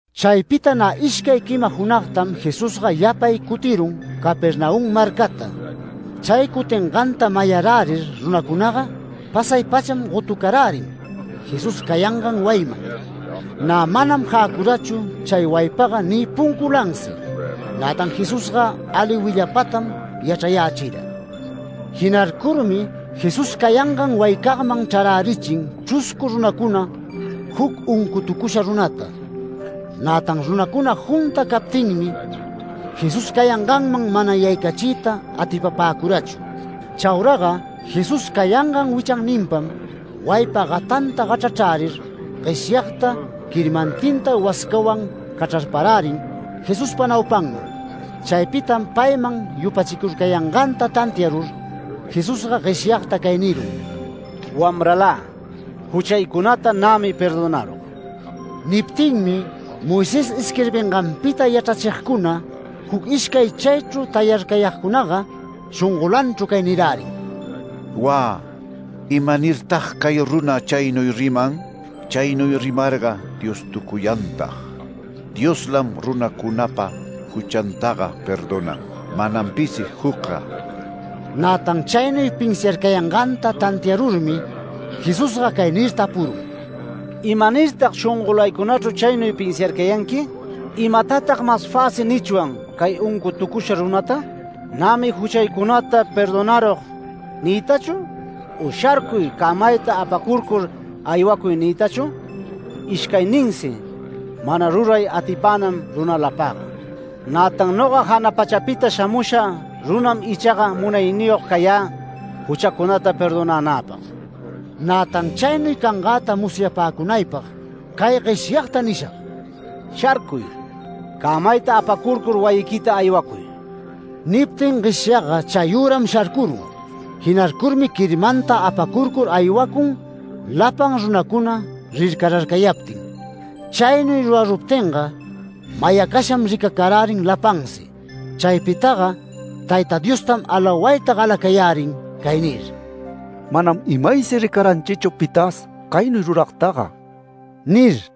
Chaypita nä ishcay quima junagtam Jesusga yapay cutirun Capernaum marcata. Chay cutinganta mayarärir runacunaga pasay-pacham gotucarärin Jesús cayangan wayiman. Nä manam jäcurachu chay wayipaga ni punculansi, nätan Jesusga ali willapatam yachrayächira. Jinarcurmi Jesús cayangan wayicagman chrarärichin chruscu runacuna juc uncutucusha runata. Nätan runacuna junta captinmi Jesús cayanganman mana yaycachiyta atipapäcurachu. Chauraga Jesús cayangan wichanninpam wayipa gatanta gachrachrärir gueshyagta quirmantinta wascawan cachrarparärin Jesuspa naupanman. Chaypitam payman yupachicurcayanganta tantiarur, Jesusga gueshyagta cay nirun: “Wamralä, juchaycunata nämi perdonarug”. Niptinmi Moisés isquirbinganpita yachrachigcuna, juc ishcay chaychru tayarcayagcunaga shongolanchru cay nirärin: “¡Wä! ¿Imanirtag cay runa chaynuy riman? Chaynuy rimarga Diostucuyantag. Dioslam runacunapa juchantaga perdonan, manam pisi jucga”. Nätan chaynuy pinsiarcayanganta tantiarurmi Jesús cay nir tapurun: “¿Imanirtag shongolaycunachru chaynuy pinsiarcayanqui? ¿Imatatag mas fäsi nichwan cay uncutucusha runata? ¿‘Nämi juchaycunata perdonarug’ niytachu? u ¿‘Sharcuy, cämayta apacurcur, aywacuy’ niytachu? Ishcayninsi mana ruray atipänan runalapagga. Nätan noga jana pachapita shamusha runam ichaga munayniyog cayä juchacunata perdonänäpag. Nätan chaynuy cangäta musyapäcunaypag cay gueshyagta nishag: Sharcuy, cämayta apacurcur wayiquita aywacuy”. Niptin gueshyagga chayüram sharcurun. Jinarcurmi quirmanta apacurcur aywacun lapan runacuna rircararcayaptin. Chaynuy ruraruptinga mayacasham ricacarärin lapansi. Chaypitaga Tayta Diostam alawayta galacayärin cay nir: “Manam imaysi ricaranchichu pitas caynuy ruragtaga” nir.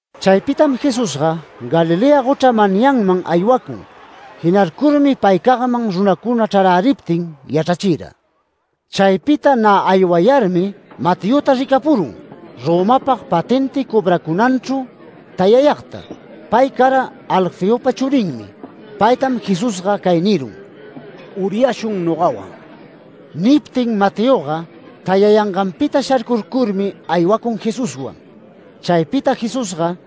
Chaypitam Jesusga Galilea gochra manyanman aywacun. Jinarcurmi paycagman runacuna chraräriptin yachrachira. Chaypita nä aywayarmi Mateota ricapurun, Romapag patenti cobracunanchru tayayagta. Pay cara Alfeopa churinmi. Paytam Jesusga cay nirun: “¡Uryashun nogawan!” Niptin Mateoga tayayanganpita sharcurcurmi aywacun Jesuswan. Chaypita Jesusga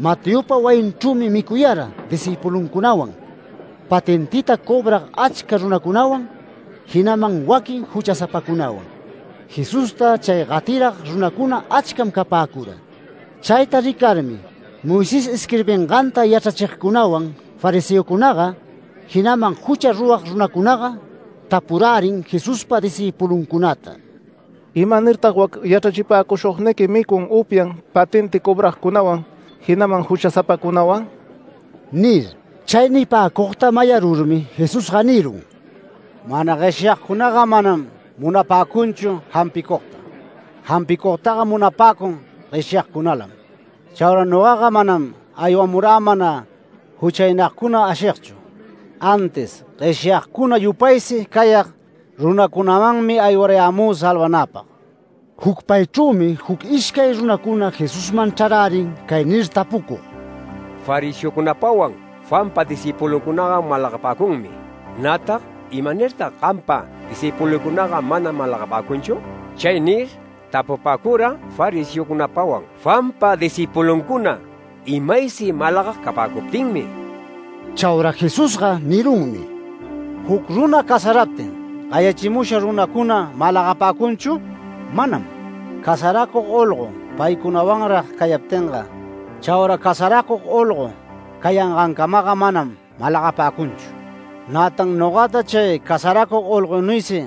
Mateopa wayinchrümi micuyara discïpuluncunawan, patentita cobrag achca runacunawan, jinaman waquin juchasapacunawan. Jesusta chay gatirag runacuna achcam capäcura. Chayta ricarmi Moisés isquirbinganta yachrachigcunawan fariseocunaga, jinaman jucha rurag runacunaga tapurärin Jesuspa discïpuluncunata: “¿Imanirtag wac yachrachipäcushugniqui micun upyan patenti cobragcunawan, jinaman juchasapacunawan?” nir. Chay nipäcugta mayarurmi Jesusga nirun: “Mana gueshyagcunaga manam munapäcunchu jampicugta. Jampicugtaga munapäcun gueshyagcunalam. Chaura nogaga manam aywamurä mana juchaynagcuna ashigchu, antis gueshyagcuna yupaysi cayag runacunamanmi aywarayämü salvanäpag”. Jucpaychrümi juc ishcay runacuna Jesusman chrarärin cay nir tapucug: “Fariseocunapawan Juanpa discïpuluncunaga malagapäcunmi, nätan ¿imanirtag gampa discïpuluycunaga mana malagapäcunchu?” Chay nir tapupäcura fariseocunapawan Juanpa discïpuluncuna imaysi malagag capäcuptinmi. Chaura Jesusga nirunmi: “¿Juc runa casaraptin gayachimusha runacuna malagapäcunchu? Manam. Casaracug olgo paycunawanrag cayaptinga, chaura casaracug olgo cayangancamaga manam malagapäcunchu. Nätan nogata chay casaracug olgonuysi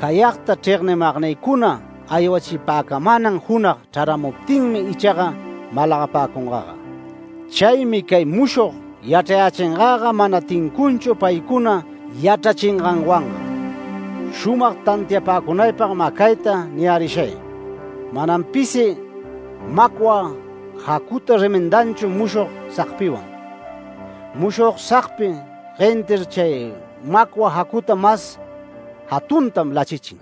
cayagta chregnimagcuna aywachipäcamänan junag chraramuptinmi ichaga malagapäcungaga. Chaymi cay mushog yachrayächingaga mana tincunchu paycuna yachrachinganwanga. Shumag tantiapäcunaypag mä cayta niyärishay: Manam pisi macwa jacuta remendanchu mushog sagpiwan. Mushog sagpi guentir chay macwa jacuta mas jatuntam lachichin.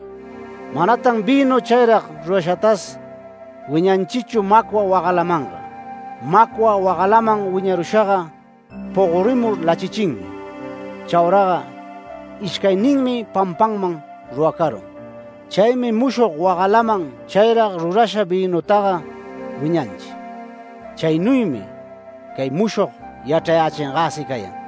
Manatan vïnu chayrag rurashatas wiñanchichu macwa wagalamanga. Macwa wagalaman wiñarushaga pogorimur lachichinmi. Chauraga ishcayninmi pampanman ruracarun. Chaymi mushog wagalaman chayrag rurasha vïnutaga wiñanchi. Chaynuymi cay mushog yachrayächingäsi cayan”.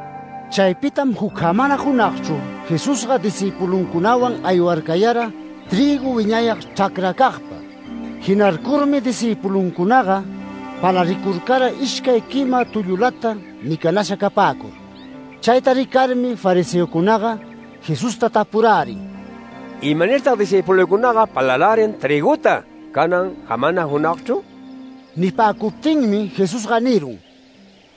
Chaypitam juc jamana junagchru Jesusga discïpuluncunawan aywarcayara trïgu wiñayag chracracagpa. Jinarcurmi discïpuluncunaga palaricurcara ishcay quima tullulata micanasha capäcur. Chayta ricarmi fariseocunaga Jesusta tapurärin: “¿Imanirtag discïpuluycunaga palarärin trïguta canan jamana junagchru?” Nipäcuptinmi Jesusga nirun: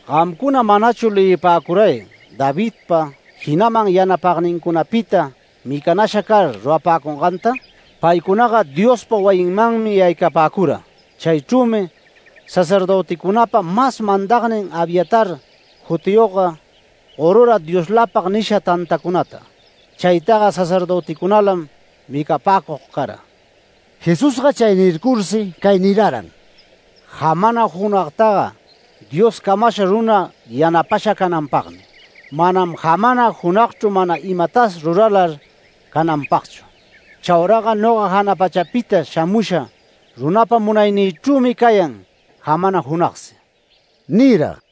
“¿Gamcuna manachu leyipäcuray Davidpita, jinaman yanapagnincunapita micanasha car rurapäcunganta? Paycunaga Diospa wayinmanmi yaycapäcura, chaychrümi sacerdöticunapa mas mandagnin Abiatar jutiyogga, gorura Dioslapag nisha tantacunata. Chaytaga sacerdöticunalam micapäcug cara”. Jesusga chay nircursi cay niraran: “Jamana junagtaga Dios camasha runa yanapasha cananpagmi; manam jamana junagchru mana imatas ruralar cananpagchu. Chauraga noga jana pachapita shamusha runapa munaynïchrümi cayan jamana junagsi” nira.